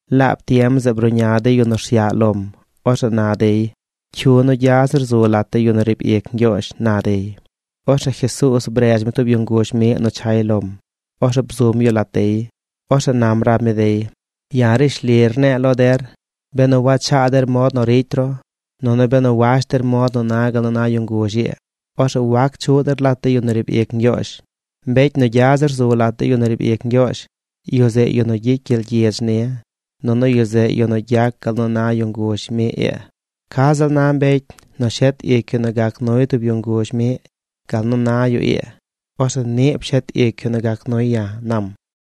Laab tiem zeꞌ bruꞌña de yu nu rsyaꞌ lom. Orzeꞌ na dey: ―¿Cyu nu gya zir zu lat de yu nu riib ic Ñgyoozh? ―na dey. Orzeꞌ Jesuuz bredz mi tub yu nguzh miꞌ nu chay lom. Orzeꞌ bzum yu lat dey. Orzeꞌ nam rab mi dey: ―Ya̱ rishli rne̱e̱ lo der, benu wachaa der mod nu ricy ru, nunu benu wash der mod nu na gal nu na yu nguzh ii, orzeꞌ wac chuꞌ der lat de yu nu riib ic Ñgyoozh. Mbecy nu gya zir zu lat de yu nu riib ic Ñgyoozh, yu zeꞌ yu nu gyicy gyel gyidz ni. Nunu yu zeꞌ yu nu gyac gal nu na yu nguzh miꞌ ii. Ca ziꞌl na mbecy nu shet ic yu nu gac nuy tub yu nguzh miꞌ gal nu na yu ii, orzeꞌ niꞌ pshet ic yu nu gac nuy ya̱ ―nam.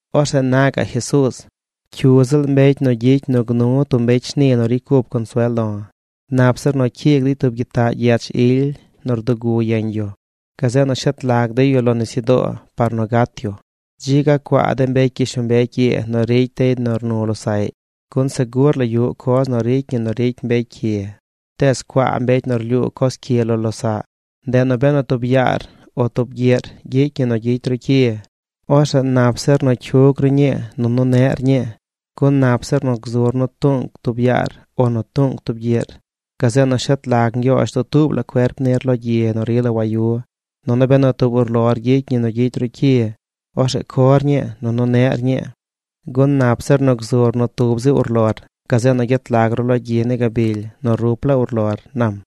Orzeꞌ na gaꞌ Jesuuz: ―Cyu ziꞌl mbecy nu gyicy nu gnu tub mbecy shni nu ricy cup consuel lo̱, nap zir nu cyiig dey tub gyitaꞌ gyech ily nu rdugu yeñ yu. Gazeꞌ nu shet lag dey yu lo nisyudoo par nu gat yu. ¡Dzi ga cuaa de mbecy gyishlombecy ii nu ricy dey nu rnu losaꞌy! Gun segur la yuꞌ coz nu ricy ñi nu ricy mbecy cyi, tees ¡cuaa mbecy nu rlyuu coz cyi lo losaꞌ! ’Ndeꞌ nu benu tub yaar o tub gyiꞌr gyicy ñi nu gyicy ru cyi, orzeꞌ nap zir nu cyug ru ñii nunu neꞌr ñii gun nap zir nu gzur nu tuꞌnc tub yaar o nu tuꞌnc tub gyiꞌr, gazeꞌ nu shet lag Ñgyoozh dutuub la cuerp nir lo gyi nu rila wayu. Nunu benu tub urlor gyicy ñi nu gyicy ru cyi, orzeꞌ cor ñii, nunu neꞌr ñii, gun nap zir nu gzur nu tub zi urlor gazeꞌ nu gyet lag ru lo gyi ni gabily nu rup laa urlor ―nam.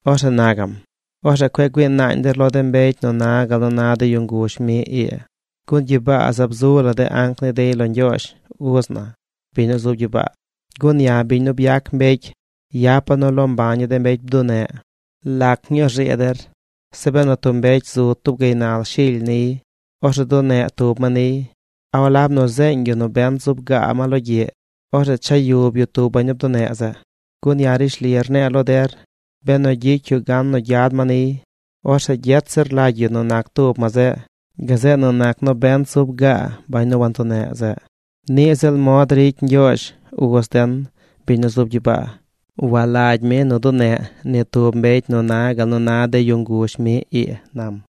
Orzeꞌ na gaꞌm: ―Orzeꞌ cueꞌ güii naañ der lo de mbecy nu na gal nu na de yu nguzh miꞌ ii. Gun gyibaa zaab zu la de anc ni dey lo Ñgyoozh, uz na, biñ nu zub gyibaa. Gun ya̱ biñ nu byac mbecy, yapa̱ nu loo mbaña̱ de mbecy bduneꞌ. ’¿Lac ñuu rzii der? Zeꞌ benu tub mbecy zu tub gaynal shily niy, orzeꞌ duneꞌ tub ma niy, ¿a walab nu zeeñ yu nobent zub gaa ma logyiꞌ, orzeꞌ cha yub yu tub bañ nu bduneꞌ zeꞌ? Gun ya̱ rishli rne̱e̱ lo der, benu gyicy yu gan nu gyad ma niy, orzeꞌ gyet zir lagy yu nu nac tub ma zeꞌ, gazeꞌ nu nac nobent zub gaa bañ nu wantuneꞌ zeꞌ. Niꞌ ziꞌl mod ricy Ñgyoozh, uz den, biñ nu zub gyibaa. Walagy mi nu duneꞌ ni tub mbecy nu na gal nu na de yu nguzh miꞌ ii ―nam.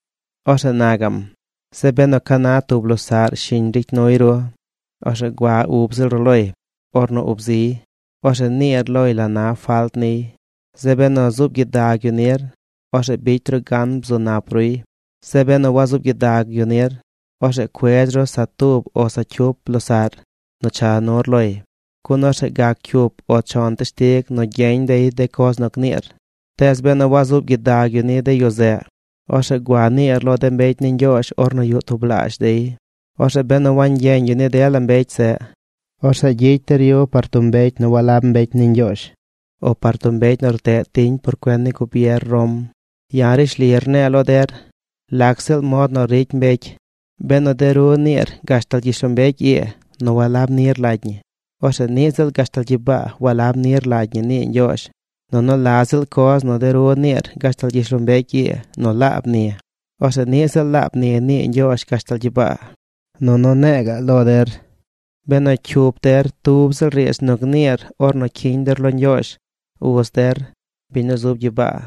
Orzeꞌ na gaꞌm: ―Zeꞌ benu ca na tub losaꞌr shiñ ricy nuy ru, orzeꞌ gua ub ziꞌl ru loy. Ornu ub ziy, orzeꞌ niir loy la na falt niy. Zeꞌ benu zuub gyidag yu nir, orzeꞌ bicy ru gan bzu nap ruy. Zeꞌ benu wazuub gyidag yu nir, orzeꞌ cuedz ru sa tub o sa cyup losaꞌr nu cha nur loy. Gun orzeꞌ gac cyup o chon teshtig nu gyeñ dey de coz nu gniir. Tees benu wazuub gyidag yu ni de yu zeꞌ, orzeꞌ gua niir lo de mbecy ni Ñgyoozh ornu yuꞌ tublaazh dey. Orzeꞌ benu wangyeñ yu ni dela mbecy zeꞌ, orzeꞌ gyicy der yu par tub mbecy nu walab mbecy ni Ñgyoozh, o par tub mbecy nu rteꞌ tiñ por cuen ni gubier Rom. ’Ya̱ rishli rne̱e̱ lo der: lac ziꞌl mod nu ricy mbecy, benu de ru niir gashtal gyishlombecy ii nu walab ni rlagy ñi, orzeꞌ niꞌ ziꞌl gashtal gyibaa walab ni rlagy ñi nii Ñgyoozh. Nunu la ziꞌl coz nu de ru niir gashtal gyishlombecy ii nu laab ni, orzeꞌ niꞌ ziꞌ laab ni nii Ñgyoozh gashtal gyibaa. ’Nunu ne̱e̱ ga̱ꞌ lo der: benu cyup der tub ziꞌl riidz nu gniir ornu cyiñ der lo Ñgyoozh, uz der, biñ nu zub gyibaa,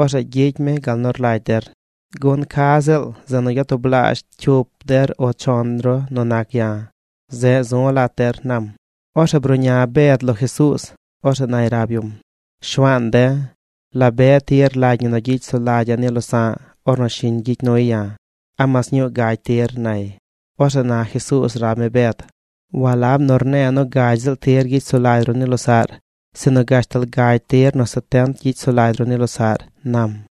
orzeꞌ gyicy mi gal nu rlagy der. Gun ca ziꞌl zeꞌ nu gyatublaazh cyup der o chon ru nu nac ya̱, zeꞌ zu̱ lat der ―nam. Orzeꞌ bruꞌña Bed lo Jesuuz. Orzeꞌ nay rab yum: ―Shuaan de̱, ¿la be tir rlagy ñi nu gyicy sulagya̱ ni losa̱ꞌ ornu shiñ gyicy nuy ya̱? ¿A mas ñuu gagy tir? ―nay. Orzeꞌ na Jesuuz rab mi Bed: ―Walab nu rne̱e̱ nu gagy ziꞌl tir gyicy sulagy ru ni losaꞌr, sinu gashtal gagy tir nu setent gyicy sulagy ru ni losaꞌr ―nam―.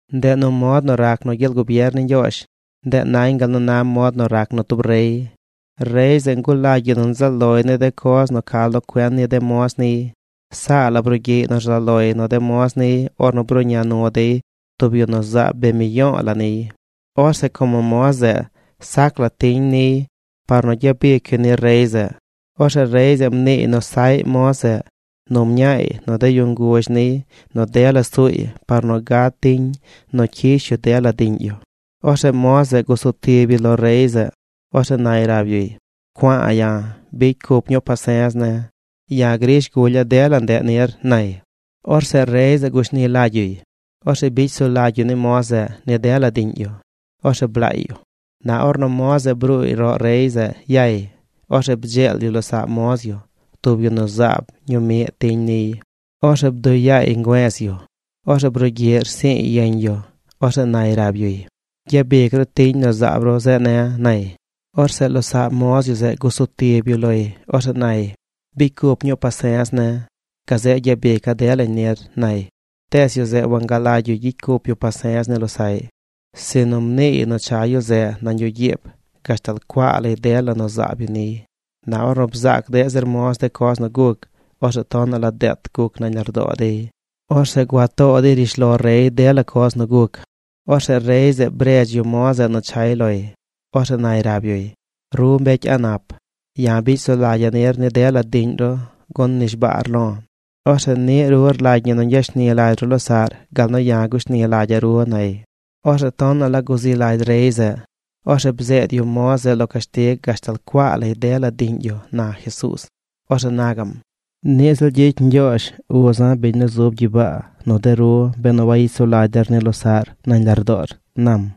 ’Ndeꞌ nu mod nu rac nu gyel gubier ni Ñgyoozh, ndeꞌ nañ gal nu na mod nu rac nu tub rey. Rey zeꞌ ngulagy yu nzaꞌ loy ni de coz nu ca lo cuen ni de moz niy. Saa la brugyiꞌy nu rzaꞌ loy nu de moz niy ornu bruꞌña nu dey tub yu nu zaab bee miyo̱o̱ la niy. Orzeꞌ como moz zeꞌ sac la tiñ niy par nu gyabic yu ni rey zeꞌ, orzeꞌ rey zeꞌ mniiy nu saꞌy moz zeꞌ nu mñaay nu de yu nguzh niy nu dela suuy par nu gad tiñ nu cyish yu dela diꞌñ yu. Orzeꞌ moz zeꞌ gusu tib yu lo rey zeꞌ. Orzeꞌ nay rab yuy: “Cua̱a̱ ya̱, bicy cup ñuu pase̱z ne̱. Ya̱ grish gulya̱ dela ndeꞌ nir”, nay. Orzeꞌ rey zeꞌ gushni lagy yuy. Orzeꞌ bicy sulagy yu ni moz zeꞌ ni dela diꞌñ yu. Orzeꞌ blaay yu. ’Na ornu moz zeꞌ bruuy roꞌ rey zeꞌ yay, orzeꞌ bdzeel yu losaꞌ moz yu, tub yu nu zaab ñuu miꞌ tiñ niy. Orzeꞌ bduꞌ yaay ngüe̱z yu. Orzeꞌ brugyiꞌ rsi̱i̱y yeñ yu. Orzeꞌ nay rab yuy: “Gyabic ru tiñ nu zaab ru zeꞌ ne̱”, nay. Orzeꞌ losaꞌ moz yu zeꞌ gusu tib yu loy. Orzeꞌ nay: “Bicy cup ñuu pase̱z ne̱. Gazeꞌ gyabica̱ delañ nir”, nay. Tees yu zeꞌ wangalagy yu gyicy cup yu pase̱z ni losaꞌy, sinu mniiy nu cha yu zeꞌ nañ yuꞌ gyiib gashtal cuaa lay dela nu zaab yu niy. Na ornu bzaac deꞌ zir moz de coz nu guc, orzeꞌ tonaꞌ la deet guc nañ lardoo dey. Orzeꞌ gua too dey rishlo rey dela coz nu guc. Orzeꞌ rey zeꞌ bredz yu moz zeꞌ nu chay loy. Orzeꞌ nay rab yuy: “¡Ru mbecy a̱ꞌ nap! Ya̱ bicy sulagya̱ nir ni dela diꞌñ ru gun mnishbaar lo̱. Orzeꞌ niꞌ ru rlagy ñi nu ñgyashni lagy ru losaꞌr gal nu ya̱ gushni lagya̱ ru”, nay. Orzeꞌ tonaꞌ la guzi lagy rey zeꞌ. Orzeꞌ bzeed yu moz zeꞌ lo cashtig gashtal cuaa lay dela diꞌñ yu ―na Jesuuz. Orzeꞌ na gaꞌm: ―Niꞌ ziꞌl gyicy Ñgyoozh, uza̱, biñ nu zub gyibaa, nu de ru benu wayicy sulagy der ni losaꞌr nañ lardoor ―nam.